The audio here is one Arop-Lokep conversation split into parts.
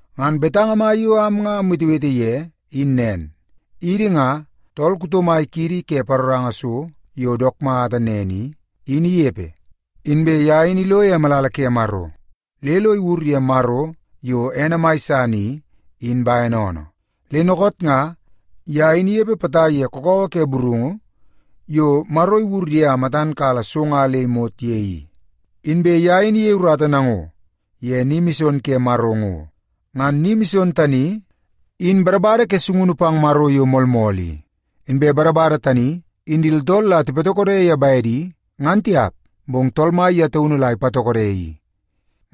Ngan betanga mai yo am nga amwetewete ye in nen: Idi nga, tool kuto mai kiidi ke paroranga so yo dook mata nen i, in inepe. Inbe ye in ilo ye malala ke Maro le lo iwur ye Maro, yo ene mai san i, in bene oonoo. Le dookoot nga, ye in inepe potai ye kakawa ke burungu yo Maro iwur ye a matan kala so nga le imot ye i, inbe ye in iyei urata nango ye ni mison ke Maro ngo. Ngan ni mison tani, in badabada ke sungunu pang Maro yo moolmool i. Inbe badabada tani, in di tooltool la tipatokode ye bedi, ngan tiap, bong Tool Mai ye taunu la ipatokode i.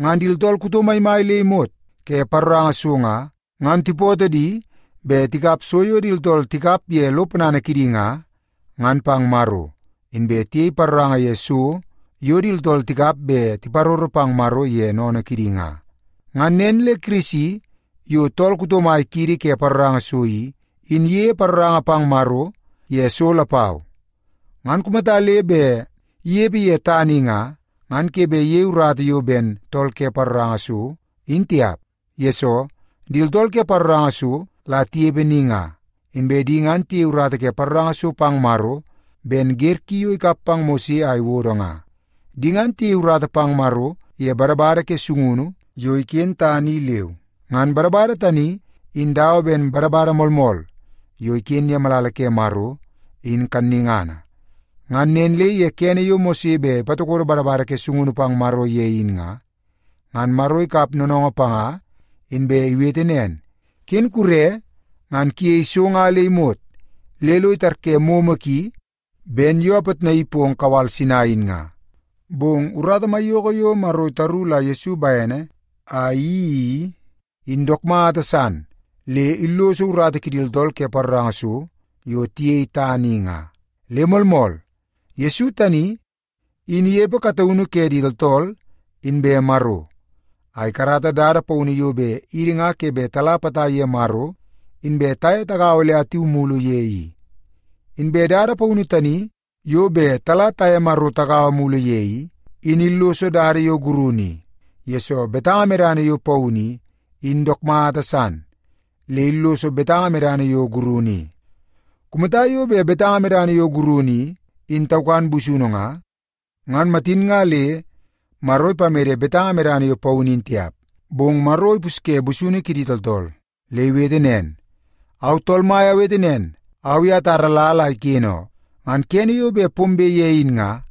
Ngan di tooltool kuto maimai le imot ke paroranga so nga, ngan tipootoo di bet tikap so yo di tooltool tikap ye lo ponana kidi nga, ngan pang Maro. Inbe tiyei paroranga ye so yo di tooltool tikap bet tiparoro pang Maro ye sennene kidi nga. Ngan nen le Kirisi, yo tool kuto mai kiidi ke paroranga so i, in iyeie paroranga pang Maro ye so lapau. Ngan kumata le bet inepe ye tana i nga, ngan ke bet iyei urata yo ben tool ke paroranga so, in tiap. Yesoo, di tooltool ke paroranga so la tinepe ni nga, inbe di ngan tiyei urata ke paroranga so pang Maro ben wer ki yo ikap pang Mose a iwodo nga. Di ngan tiyei urata pang Maro ye badabada ke sungunu yo iken tana i leu. Ngan badabada tani in dawa ben badabada moolmool yo iken ye malala ke Maro, in kannungana. Ngan nen le ye kene yo Mose bet ipatokodo badabada ke sungunu pang Maro ye in nga, ngan Maro ikap noonoongoo panga inbe iwete nen, “Ken kure ngan kuyei so nga le imot le lo itarye momo ki ben yo apitnai pong kawal Sinai in nga.” Bong urata maiyoko yo Maro itaru la Yesu bene a iyeii i, in dook mata san le illoso urata kidi tooltool ke paroranga so yo tiyei tana i nga. Le moolmool, Yesu tani in inepe kataunu ke di tooltool inbe Maro, a ikarata dada paunu yo bet idi nga ke bet tala potai ye Maro inbe taye tagaua le atu mulu ye i. Inbe dada paunu tani yo bet tala taye Maro tagaua mulu ye i, in illoso dada yo gurunu i, yesoo betanga medana yo paunu i, in dook mata san le illoso betanga medana yo gurunu i. Kumata yo bet betanga medana yo gurunu i, in taukan busunu nga, ngan matin nga le Maro ipamede betanga medana yo paunu in tiap. Bong Maro ipusye busunu kidi tooltool, le iwete nen, “Au Tool Mai awete nen, au i atara lal a iken oo. Ngan kene yo bet pombe ye in nga,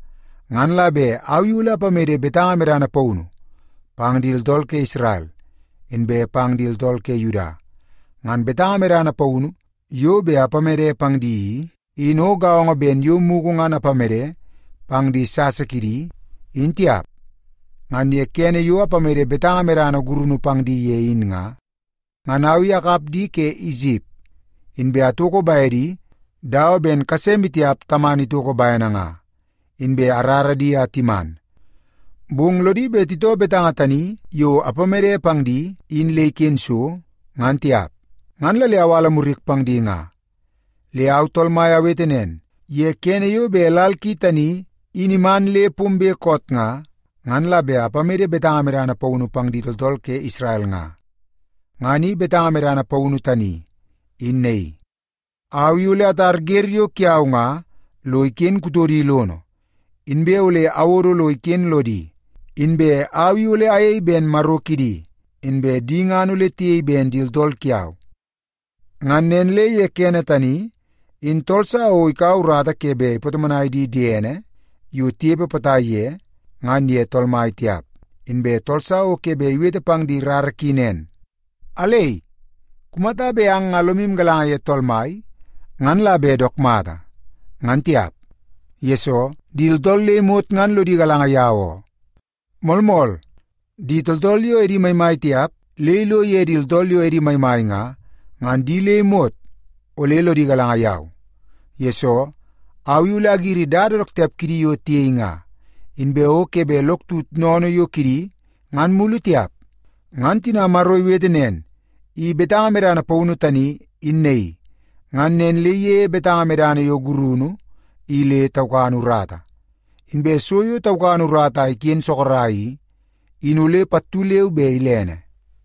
ngan la bet au i ole apamede betanga medana paunu pang di tooltool ke Isrel, inbe pang di tooltool ke Yuda. Ngan betanga medana paunu yo bet apamede pang di i, in o gaongo ben yo mugu ngan apamede pang di sasa kidi, in tiap. Ngan ye kene yo apamede betanga medana gurunu pang di ye in nga, ngan au i akap di ke Isip, inbe atoko bedi dawa ben kase maitiap tamana itoko bene nga, inbe arara di a timan. Bong lodi bet titoo betanga tani yo apamede pang di, in le iken so, ngan tiap, ngan la le awala murik pang di nga. Le au Tool Mai awete nen, ye kene yo bet lal ki tani in iman le pombe koot nga, ngan la bet apamede betanga medana paunu pang di tooltool ke Isrel nga. Ngan i betanga medana paunu tani, in naii: Au i ole atar wer yo kiau nga lo iken kutodi lono, inbe ole awodo lo iken lodi. Inbe au i ole ayei ben Maro kidi, inbe di ngan ole tiyei ben di tooltool kiau. Ngan nen le ye kene tani, in tool sa o ikaua urata ke bet ipatomonai di diene yo tinepe potai ye, ngan ye Tool Mai tiap. Inbe tool sa o ke bet iwete pang di rara ki nen, ‘Alei, kumata bet ang nga lomu galanga ye Tool Mai, ngan la bet dook mata nga,’ ngan tiap. Yesoo, di tooltool le imot ngan lodi galanga yau oo. Moolmool, di tooltool yo edi maimai tiap le ilo ye di tooltool yo edi maimai nga, ngan di le imot ole lodi galanga yau. Yesoo, au i ole agiri dada dook tiap kidi yo tiyei nga, inbe o ke bet lok tut sennene yo kidi ngan mulu tiap.” Ngan tina Maro iwete nen, “I betanga medana paunu tani, in naii”, ngan nen le iyeie betanga medana yo gurunu i le taukan urata. Inbe so yo taukan urata a iken sorok i, in ole pattu leu be ilene.